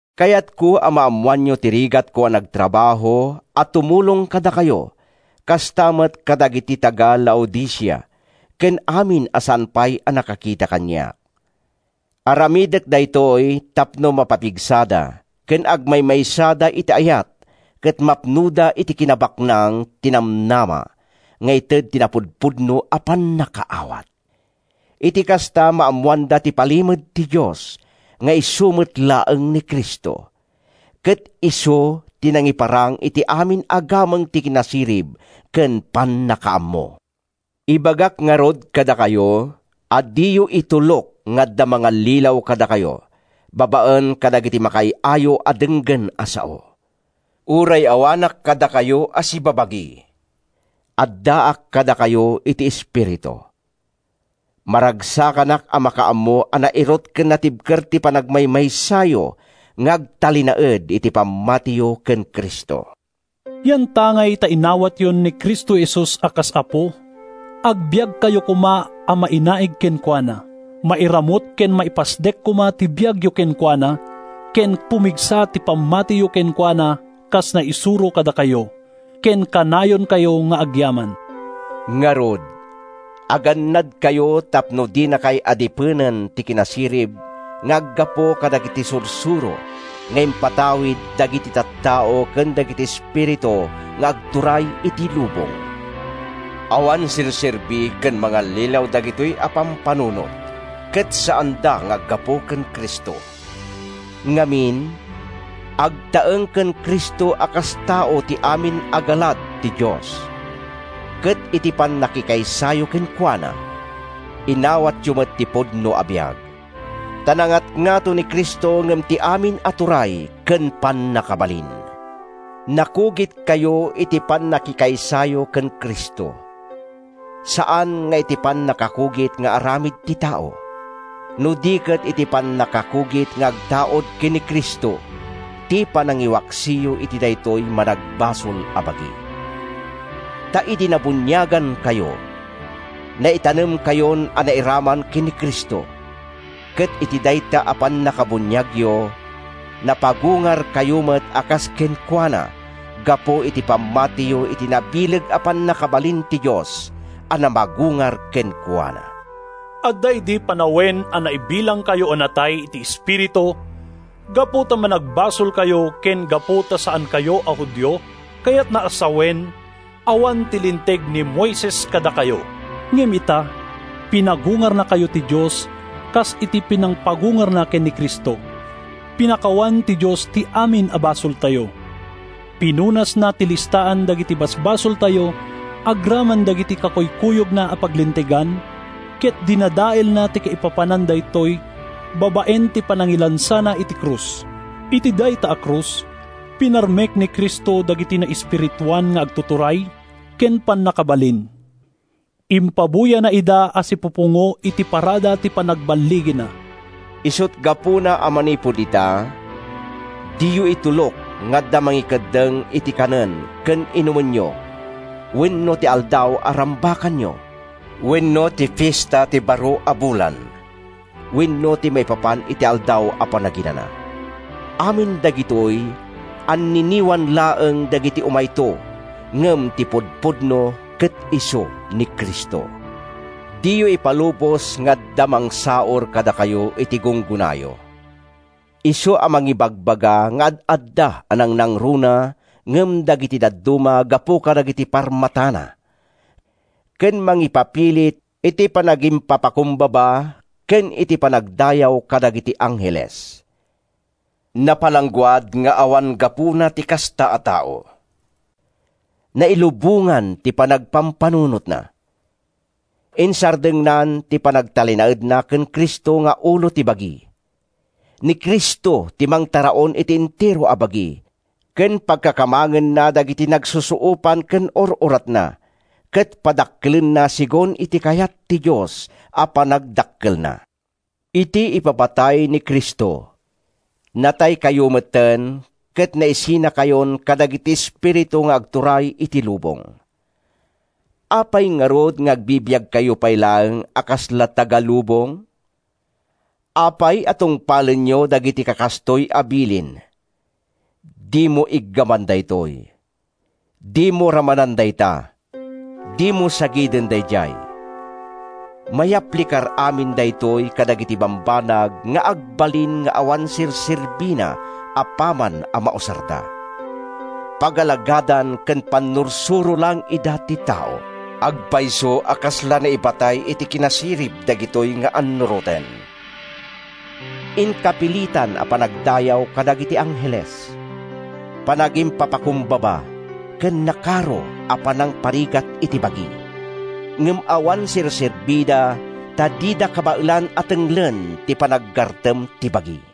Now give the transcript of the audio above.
Kayatko a maammoanyo ti rigatko a nagtrabaho a tumulong kadakayo kasta met kadagiti taga-Laodicea ken amin a saan pay a nakakita kaniak. Aramidek daytoy tapno mapapigsada ken agmaymaysada iti ayat ket mapnoda iti kinabaknang ti namnama nga ited ti napudpudno a pannakaawat. Iti kasta, maammoanda ti palimed ti Dios nga isu met laeng ni Cristo, ket isu ti nangiparang iti amin a gameng ti kinasirib ken pannakaammo. Ibagak ngarud kadakayo a diyo itulok nga adda mangallilaw kadakayo babaen kadagiti makaay-ayo a denggen a sao. Uray awanak kadakayo a sibabagi, addaak kadakayo iti espiritu. Maragsakanak a makaammo a nairut ken natibker ti panagmaymaysayo nga agtalinaed iti pammatiyo ken Cristo. Yantangay ta inawatyon ni Cristo Jesus a kas Apo, agbiagkayo koma a mainaig kenkuana. Mairamut ken maipasdek koma ti biagyo kenkuana, ken pumigsa ti pammatiyo kenkuana kas naisuro kadakayo. Ken kanayonkayo nga agyaman. Ngarud, agannadkayo tapno dinakay adipenen ti kinasirib nga aggapu kadagiti sursuro nga impatawid dagiti tattao ken dagiti espiritu nga agturay iti lubong. Awan serserbi ken mangallilaw dagitoy a pampanunot ket saanda nga aggapu ken Cristo. Ngamin, agtaeng ken Cristo a kas tao ti amin a galad ti Dios, ket iti pannakikaysayo kenkuana, inawatyo met ti pudno a biag. Ta nangatngato ni Cristo ngem ti amin turay ken pannakabalin. Nakugitkayo iti pannakikaysayo ken Cristo, saan nga iti pannakakugit nga aramid ti tao, no di ket iti pannakakugit nga agtaud ken ni Cristo—ti panangiwaksiyo iti daytoy managbasol a bagi. Ta idi nabuniagankayo, naitanemkayon a nairaman ken Cristo, ket iti dayta a pannakabuniagyo, napagungarkayo met a kas kenkuana gapu iti panamatiyo iti nabileg a pannakabalin ti Dios a namagungar kenkuana. Adda idi panawen a naibilangkayo a natay iti espiritu gapu ta managbasolkayo ken gapu ta saankayo a Judio, kayatna a sawen, awan ti linteg ni Moises kadakayo. Ngem ita, pinagungarnakayo ti Dios kas iti pinangpagungarna ken ni Cristo. Pinakawan ti Dios ti amin a basoltayo. Pinunasna ti listaan dagiti basbasoltayo agraman dagiti kakuykuyogna a paglintegan, ket dinadaelna ti kaipapanan daytoy babaen ti panangilansana iti krus. Iti dayta a krus, pinarmek ni Cristo dagiti naespirituan nga agtuturay ken pannakabalin. Impabuyana ida a sipupungo iti parada ti panagballigina. Isut’ gapuna a manipud ita, diyo itulok nga adda mangikeddeng iti kanen ken inumenyo, wenno ti aldaw a rambakanyo, wenno ti Fiesta ti Baro a Bulan, wenno ti maipapan iti Aldaw a Panaginana. Amin dagitoy, anniniwan laeng dagiti umayto; ngem ti pudpudno ket isu ni Cristo. Diyo ipalubos nga adda mangsaur kadakayo iti gunggonayo, isu a mangibagbaga nga ad-adda a nangnangruna ngem dagiti dadduma gapu kadagiti parmatana ken mangipapilit iti panagimpapakumbaba ken iti panagdayaw kadagiti angheles. Napalangguad nga awan gapuna ti kasta a tao. Nailubongan ti panagpampanunotna. Insardengnan ti panagtalinaedna ken Cristo nga ulo ti bagi. Ni Cristo ti mangtaraon iti entero a bagi, ken pagkakamangenna dagiti nagsusuopan ken ur-uratna ket padakkelenna segun iti kayat ti Dios a panagdakkelna. Iti ipapatay ni Cristo, nataykayo metten ket naisinakayon kadagiti espiritu nga agturay iti lubong. Apay ngarud nga agbibiagkayo pay laeng a kasla taga-lubong? Apay a tungpalenyo dagiti kakastoy a bilin: “Dimo iggaman daytoy,” “Dimo ramanan dayta,” “Dimo sagiden daydiay”? Mayaplikar amin daytoy kadagiti bambanag nga agbalin nga awan serserbina apaman a mausarda. Pagalagadan ken pannursuro laeng ida ti tao. Agpayso a kasla naibatay iti kinasirib dagitoy nga annuroten: inkapilitan a panagdayaw kadagiti angheles, panagimpapakumbaba, ken nakaro a panangparigat iti bagi. Ngem awan serserbida ta dida kabaelan a tenglen ti panaggartem ti bagi.